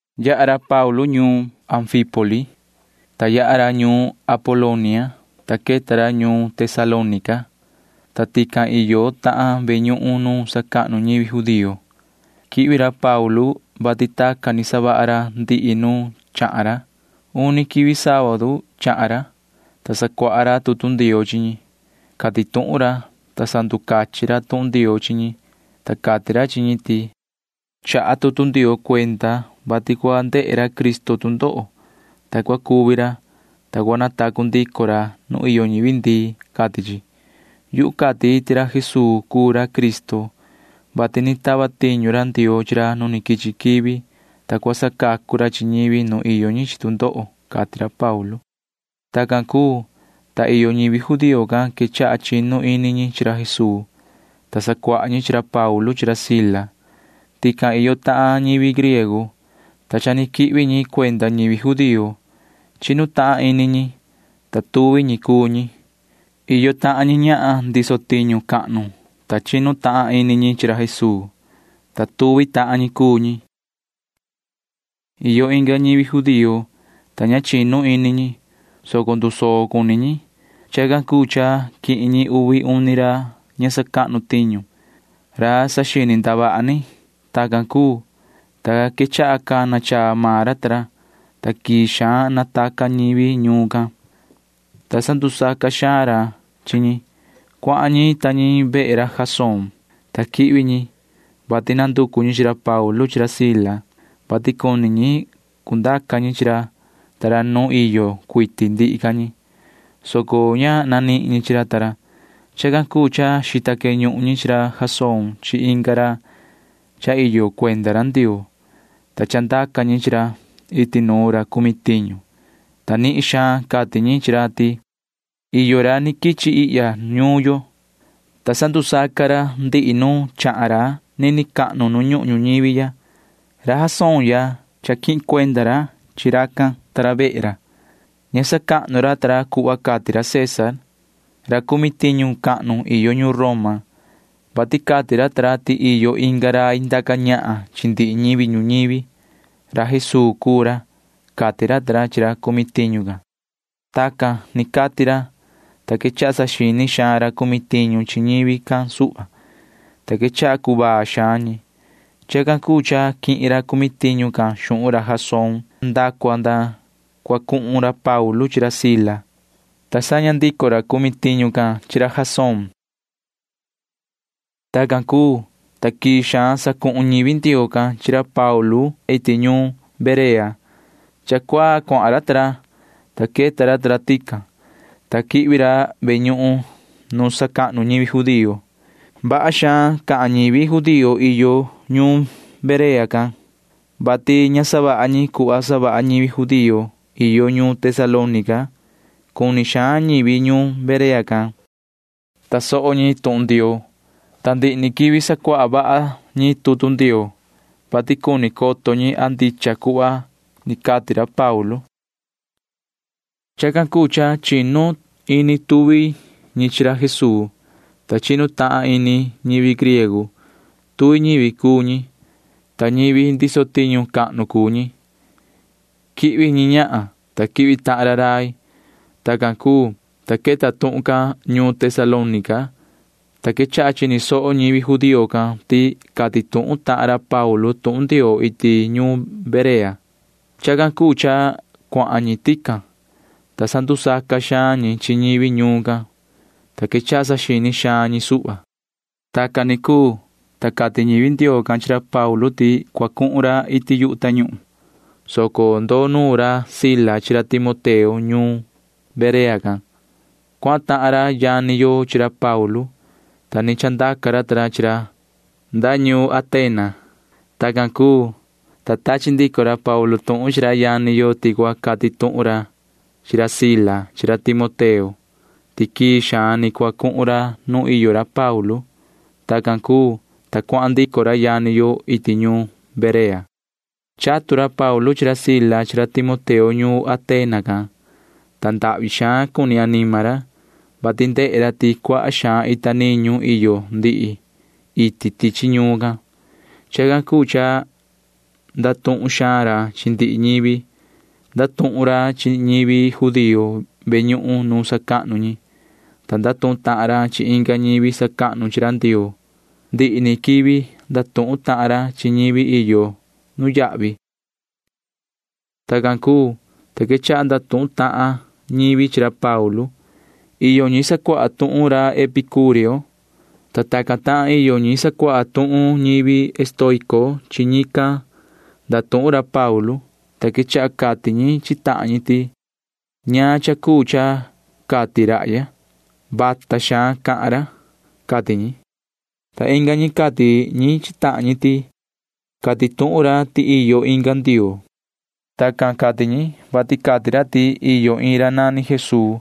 Yaha ra Paulu ta ra ñuun Amfípoli, ta yaha ra ñuun Apolonia, ta queta ra ñuun Tesalónica, ta tican iyo tahan ve ñuhun nu sacahnu ñivi judío. Quihvi ra Paulu, vati tacan ni savaha ra ndihi nu chahan ra. Uni quivi sábadu chahan ra, ta sacuaha ra tutu Ndioo chi ñi. Cati tuhun ra, ta sanducachin ra tuhun Ndioo chi ñi, ta cati ra chi ñi ti: ―Chaha tutu Ndioo cuenda, vati cua ndehe ra Cristo tu ndoho, ta cua cuvi ra, ta cua natacu ndico ra nu iyo ñivi ndii, cati chi. Yuhu cati ti ra Jesuu cuu ra Cristo, [vati ni tava tiñu ra Ndioo chi ra nu quichi quivi, ta cua sacacu ra chi ñivi nu iyo ñi chi tu ndoho] ―cati ra Paulu. Tacan cuu, ta iyo ñivi judío can quechaha chinu ini ñi chi ra Jesuu, ta sacuaha ñi chi ra Paulu chi ra Sila. Tican iyo tahan ñivi griego, ta cha ni quihvi ñi cuenda ñivi judío. Chinu tahan ini ñi, ta tuvi ñi cuu ñi. Iyo tahan ñi ñahan cahnu, ta chinu tahan ini ñi chi ra Jesuu, ta tuvi tahan ñi cuu ñi. Iyo inga ñivi judío, ta ña chinu ini ñi, soco ndusoo cuni ñi. Chacan cuu cha quihin ñi uvi uni ra ña sacahnu tiñu―ra saxini ndavaha ni. Tacan cuu, ta quechaha cana chaa maan ra ta ra, ta quii xaan nataca ñivi ñuun can, ta sandusaca xaan ra chi ñi. Cuahan ñi ta ñi vehe ra Jasón, ta quihvi ñi, vati nanducu ñi chi ra Paulu chi ra Sila, vati cuni ñi cundaca ñi chi ra ta ra nu iyo cuiti ndihi ca ñi, soco ña nanihin ñi chi ra ta ra. Chacan cuu cha xita queñuhun ñi chi ra Jasón chi inga ra cha iyo cuenda Ndioo, ta chandaca ñi chi ra iti nuun ra cumi tiñu, ta nihin xaan cati ñi chi ra ti: ―Iyo ra ni quichi ihya ñuun yo, ta sandusaca ra ndihi nu chahan ra nini cahnu nu ñuhun ñuñivi ya. Ra Jasón ya cha quihin cuenda ra chi racan ta ra vehe ra. Ña sacahnu ra ta ra cuhva cati ra César―ra cumi tiñu cahnu iyo ñuun Roma, vati cati ra ta ra ti iyo inga rai ndaca ñahan chi ndihi ñivi ñuñivi. Ra Jesuu cuu ra ―cati ra chi ra cumi tiñu can. Tacan ni cati ra, ta quechaha saxini xaan ra cumi tiñu chi ñivi can suhva, ta quechaha cuvaa xaan ñi. Chacan cuu cha quihin ra cumi tiñu can xuhun ra Jasón ta ra nda cua nda cua cuhun ra Paulu chi ra Sila, ta saña ndico ra cumi tiñu can chi ra Jasón ta ra. Tacan cuu, ta quii xaan sacuhun ñivi Ndioo can chi ra Paulu ta ra iti ñuun Berea. Cha cuaa cuahan ra ta ra, ta queta ra ta ra tican, ta quihvi ra ve ñuhun nu sacahnu ñivi judío. Vaha xaan ca ñivi judío iyo ñuun Berea can, vati ña savaha ñi cuhva savaha ñivi judío iyo ñuun Tesalónica. Cuni xaan ñivi ñuun Berea can tasoho ñi tuhun Ndioo, ta ndihi ni quivi sacuaha vaha ñi tutu Ndioo, vati cuni coto ñi a ndicha cuhva ni cati ra Paulu. Chacan cuu cha chinu ini tuvi ñi chi ra Jesuu, ta chinu tahan ini ñivi griego. Tuvi ñivi cuu ñi, ta ñivi cahnu cuu ñi. Quihvi ñi ñahan, ta quihvi tahan ra rai. Tacan cuu, ta queta tuhun can ñuun Tesalónica, ta quechaha chini soho ñivi judío can ti cati tuhun tahan ra Paulu tuhun Ndioo iti ñuun Berea. Chacan cuu cha cuahan ñi tican, ta sandusaca xaan ñi chi ñivi ñuun can, ta quechaha saxini xaan ñi suhva. Tacan ni cuu, ta cati ñivi Ndioo can chi ra Paulu ti cua cuhun ra iti yu tañuhun, soco ndoo nuun ca ra Sila chi ra Timoteo ñuun Berea can. Cuahan tahan ra yani yo chi ra Paulu, ta ni chandaca ra ta ra chi ra nda ñuun Atena. Tacan cuu, ta tachi ndico ra Paulu tuhun chi ra yani yo ti cua cati ra chi ra Sila chi ra Timoteo ti quii xaan ni cua cuhun ra nu iyo ra Paulu. Tacan cuu, ta cuahan ndico ra yani yo iti ñuun Berea. Chatu ra Paulu chi ra Sila chi ra Timoteo ñuun Atena can, ta ndahvi xaan cuni anima ra, vati ndehe ra ti cuaha xaan ita niñu iyo ndihi iti tichi ñuun can. Chacan cuu cha ndatuhun xaan ra chi ndihi ñivi. Ndatuhun ra chi ñivi judío ve ñuhun nu sacahnu ñi, ta ndatuhun tahan ra chi inga ñivi sacahnu chi ra Ndioo. Ndihi ni quivi ndatuhun tahan ra chi ñivi iyo nuyahvi. Tacan cuu, ta quechaha ndatuhun tahan ñivi chi ra Paulu. Iyo ñi sacuaha tuhun ra Epicureo, ta tacan tahan iyo ñi sacuaha tuhun ñivi estoico. Chi ñican ndatuhun ra Paulu, ta quechaha cati ñi chi tahan ñi ti: ―¿Ñaan cha cuu cha cati rahya? Vata xaan cahan ra ―cati ñi. Ta inga ñi cati ñi chi tahan ñi ti: ―Cati tuhun ra ti iyo inga ndioo. Tacan cati ñi, vati cati ra ti iyo iin ra nani Jesuu,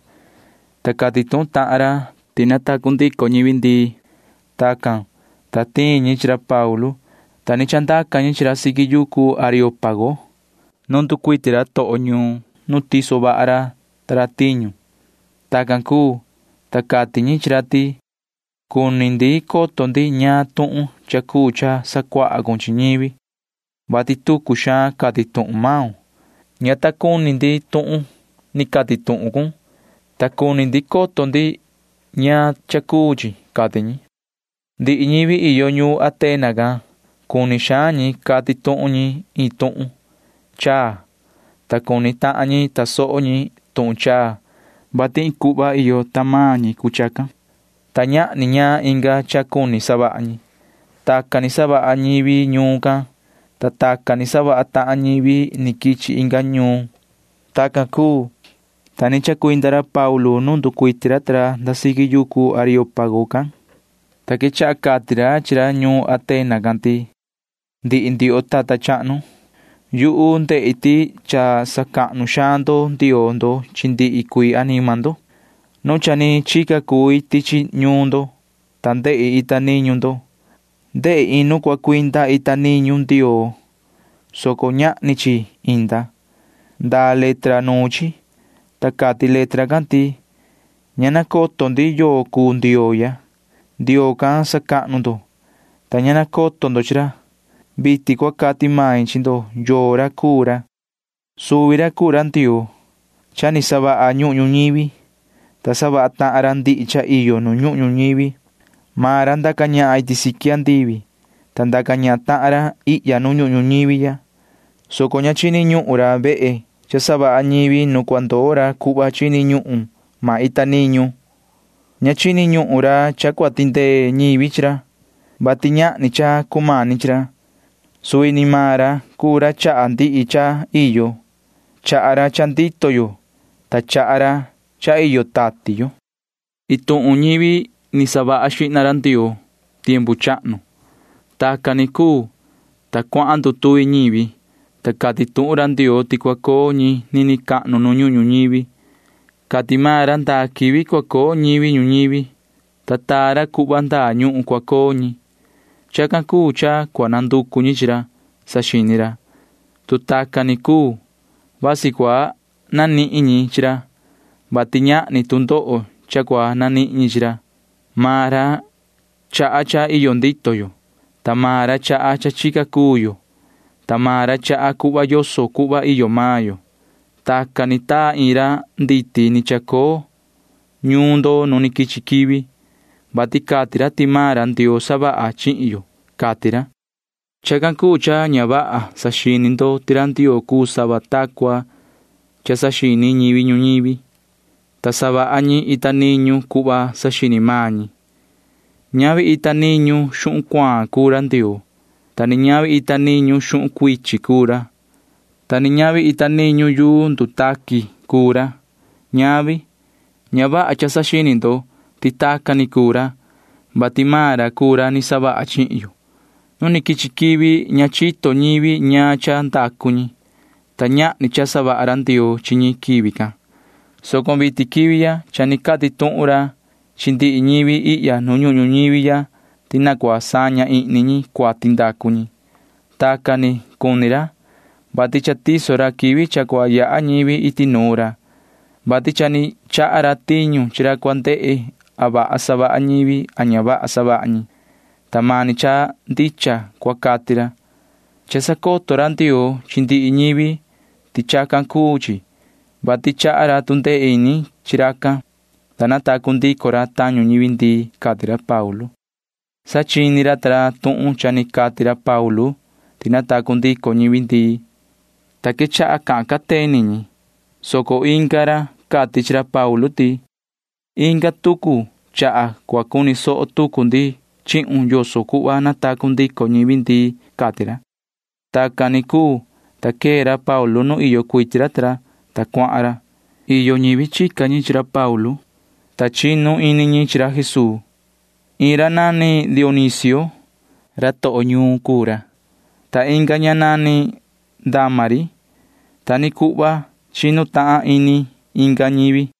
ta cati tuhun tahan ra tuhun ti natacu ndico ñivi ndii. Tacan, ta tiin ñi chi ra Paulu, ta ni chandaca ñi chi ra siqui yucu Areópago nu nducuiti ra toho ñuun nu tiso vaha ra ta ra tiñu. Tacan cuu, ta cati ñi chi ra ti: ―Cuni ndi coto ndi ñaan tuhun chaa cuu cha sacuaha cun chi ñivi, vati tucu xaan cati tuhun maun. Ña ta cuni ndi tuhun ni cati tuhun cun, ta cuni coto ndi ñaan cha cuu chi ―cati ñi. Ndihi ñivi iyo ñuun Atena can―cuni xaan ñi cati tuhun ñi iin tuhun chaa, ta cuni tahan ñi tasoho ñi tuhun chaa, vati iin cuhva iyo tahan maan ñi cuu chacan, ta ñahni ñaan inga cha cuni savaha ñi. Tacan ni savaha ñivi ñuun can, ta tacan ni savaha tahan ñivi ni quichi inga ñuun. Tacan cuu, ta ni chacuinda ra Paulu nu nducuiti ra ta ra nda siqui yucu Areópago can, ta quechaha cati ra chi ra ñuun Atena can ti: ―Ndihi ndioho tata chahnu, yuhu ndehi ti cha sacahnu xaan ndo ndioo ndo chi ndihi cuii anima ndo. Nu cha ni chica cui tichi ñuun ndo, ta ndehi ita niñu ndo. Ndehi iin nu cua cuinda ita niñu ndioo, soco ñahni chi inda. Ndaa letra nuun chi, ta cati letra can ti: “Ña nacoto ndi yoo cuu ndioo ya.” Ndioo can sacahnu ndo, ta ña nacoto ndo chi ra. Vitin cua cati main chi ndo yoo ra cuu ra. ’Suvi ra cuu ra Ndioo cha ni savaha ñuhun ñuñivi, ta savaha tahan ra ndihi cha iyo nu ñuhun ñuñivi. Maan ra ndaca ñahan iti siqui andivi, ta ndaca ñahan tahan ra ihya nu ñuhun ñuñivi ya, soco ña chini ñuhun ra vehe cha savaha ñivi nu cua ndoo ra cuhva chini ñuhun maan ita niñu. Ña chini ñuhun ra cha cua tindee ñivi chi ra, vati ñahni cha cumani chi ra. Suvi ni maan ra cuu ra chaha ndihi cha cha iyo. Chaha ra cha ndito yo, ta chaha ra cha iyo tati yo. ’Iin tuhun ñivi ni savaha xihna ra Ndioo [tiempu chahnu]. Tacan ni cuu, ta cuahan ndutuvi ñivi, ta cati tuhun ra Ndioo ti cua coo ñi nini cahnu nu ñuhun ñuñivi. Cati maan ra ndaa quivi cua coo ñivi ñuñivi, ta taa ra cuhva ndaa ñuhun cua coo ñi. Chacan cuu cha cua nanducu ñi chi ra, saxini ra. Tu tacan ni cuu, vasi cua nanihin ñi chi ra, vati ñahni tu ndoho cha cua nanihin ñi chi ra. Maan ra chaha cha iyo ndito yo, ta maan ra chaha cha chica cuu yo, ta maan ra chaha cuhva yoso cuhva iyo maan yo. Tacan ni taa iin ra nditi ni chacoo ñuun ndo nu ni quichi quivi, vati cati ra ti maan ra Ndioo savaha chihin yo, cati ra. Chacan cuu cha ña vaha saxini ndo ti ra Ndioo cuu sava ta cua saxini ñivi ñuñivi, ta savaha ñi ita niñu cuhva saxini maan ñi. Ñavi ita niñu xuhun cuaan cuu ra Ndioo, ta ni ñavi ita niñu xuhun cuichin cuu ra, ta ni ñavi ita niñu yuu ni ndutaqui cuu ra. Ñavi. Ña vaha cha saxini ndo ti tacan ni cuu ra, vati maan ra cuu ra ni savaha chihin yo. Nu ni quichi quivi ña chito ñivi ñaan cha ndacu ñi, ta ñahni cha savaha ra Ndioo chi ñi quivi can, soco vitin quivi ya cha ni cati tuhun ra chi ndihi ñivi ihya nu ñuhun ñuñivi ya ti na cua saña ihni ñi cuati ndacu ñi. Tacan ni cuni ra, vati cha tiso ra quivi cha cua yaha ñivi iti nuun ra, vati cha ni chaha ra tiñu chi ra cua ndehe a vaha savaha ñivi a ña vaha savaha ñi, ta mani cha ndicha cua cati ra. Cha sacoto ra Ndioo chi ndihi ñivi ti chacan cuu chi, vati chaha ra tu ndee ini chi racan, ta natacu ndico ra tañu ñivi ndii ―cati ra Paulu. Sa chini ra ta ra tuhun cha ni cati ra Paulu ti natacu ndico ñivi ndii, ta quechaha cahan cateni ra, soco inga ra cati chi ra Paulu ti: ―Inga tucu chaha cua cuni soho tucu ndi chihun yoso cuhva natacu ndico ñivi ndii ―cati ra. Tacan ni cuu, ta quee ra Paulu nu iyo cuiti ra ta ra, ta cuahan ra. Iyo ñivi chica ñi chi ra Paulu, ta chinu ini ñi chi ra Jesuu. Iin ra nani Dionisio. Ra toho ñuun cuu ra, ta inga ña nani Dámari. Ta ni cuhva chinu tahan ini inga ñivi.